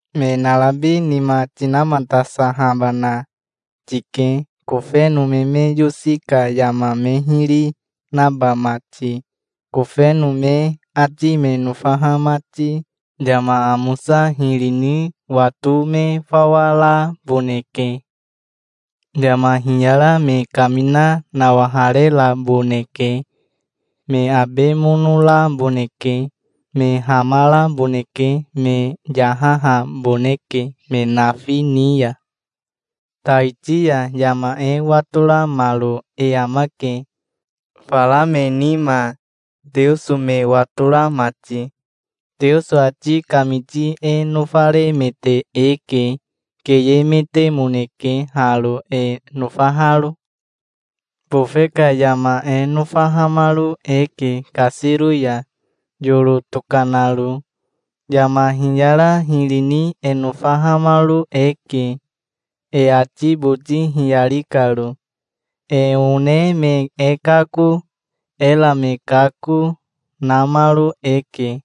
Me narabi nima tinamatasahabana tike, kofeno me me yosi ka yama me hiri naba mati, kofeno me ati me nofaha mati. Yama amosa hiri ni wato me fawa raboneke. Yama hiyara me kamina nawahareraboneke. Me abe mono raboneke. Me hamaraboneke. Me yahahaboneke me nafi ni ya. Taiti ya yama e watoramaro e amake, fara me nima, Teoso me watora mati. Teoso ati kamiti e nofaremete eke. Keyemetemoneke haro, e nofaharo. Bofe ka yama e nofahamaro eke kasiro ya, yoro tokanaro. Yama hiyara hiri ni e nofahamaro eke, e ati boti hiyari karo. E one me e kako, era me kako, namaro eke.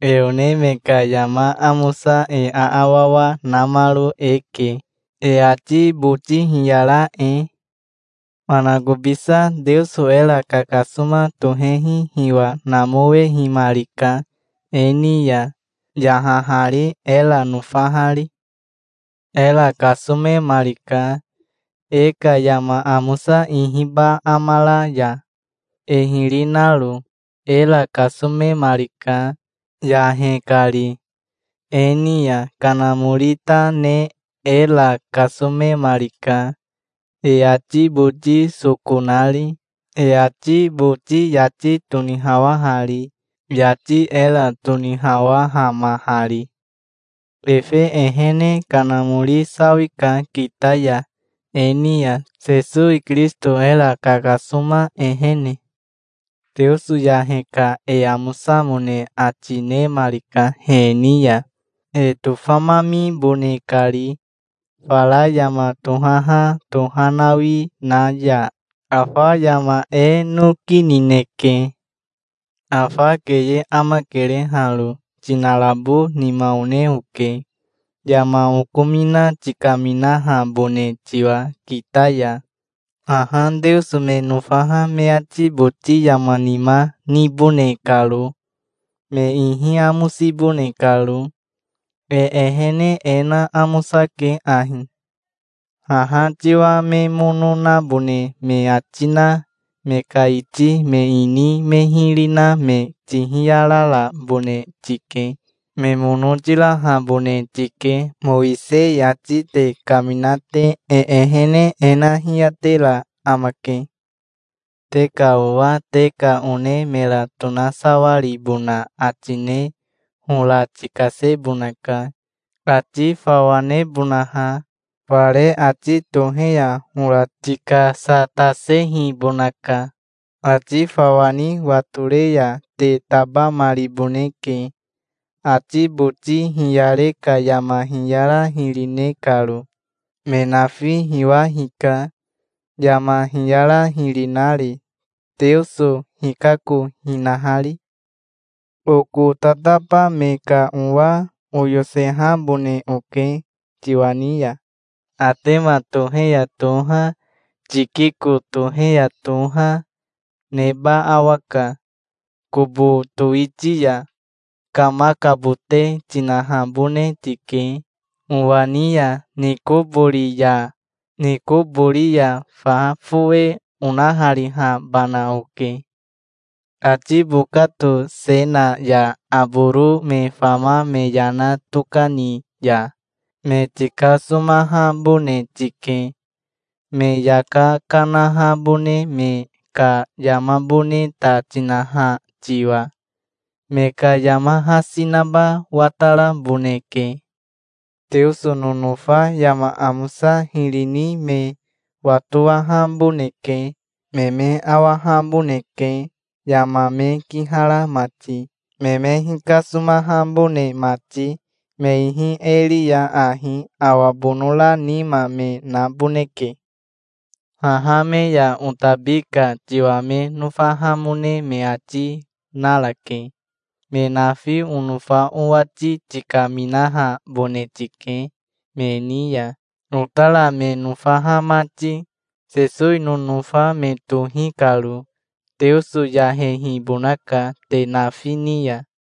E one me ka yama amosa e aawawa namaro e ke, e ati boti hiyara e. Manakobisa Teoso era kakasoma tohehi hiwa namowehimarika e ni ya, yahahari, era nofahari. Era kasomemarika, e ka yama amosa ihiba amara ya, e hiri naro. Era kasomemarika, yahe kari. E ni ya Kanamori ta ne era kasomemarika, e ati boti soko nari, e ati boti yati tonihawahari, yati era tonihawahamahari. Efe ehene Kanamori sawika kita ya e ni ya, Sesowi Kirisito era kakasoma ehene. Teoso yahe ka e amosamone ati nemarika he ni ya, e tofamamibone kari, fara yama tohaha tohanawi na ya. Afa yama e noki nineke. Afa keye amakere haro. Tinarabo nima one oke, yama okomina tikaminahabone tiwa kita ya, haha Teoso me nofaha me ati boti yama nima nibone karo, me ihi amosibone karo. E ehene e na amosake ahi. Haha tiwa me mono nabone me ati na me ka iti me ini me hiri na me tihiyararabone tike. Me mono tirahabone tike Mowisei ati te kamina te. E ehene e na hiyatera amake. Te ka owa te ka one mera tonasawaribona ati ne hora tikasebonaka, ati fawa nebonaha. Fare ati tohe ya hora tikasatasehibonaka. Ati fawa ni watore ya te tabamariboneke, ati boti hiyare ka yama hiyara hiri ne karo. Me nafi hiwa hika, yama hiyara hiri nari, Teoso hikako hinahari. Oko tataba me ka owa oyosehabone oke tiwa ni ya. Atema tohe ya toha, Tikiko tohe ya toha, neba awaka. Kobo towiti ya kamakabote tinahabone tike owa ni ya Nikobori ya. Nikobori ya fa fowe onaharihabana oke. Atibokato Sena ya Aboro me fama me yana tokani ya me tikasomahabone tike, me yaka kanahabone me ka yamabone ta tinaha tiwa. Me ka yama hasi naba wataraboneke. Teoso nonofa yama amosa hiri ni me watowahaboneke. Me me awahaboneke yama me kihara mati, me me hikasomahabone mati. Me ihi e ri ya ahi awa bonora nima me naboneke. Haha me ya otabi ka tiwa me nofahamone me ati narake. Me nafi onofa owati tikaminahabone tike me ni ya, otara me nofaha mati, Sesowi nonofa me tohi karo. Teoso yahehibonaka te nafi ni ya.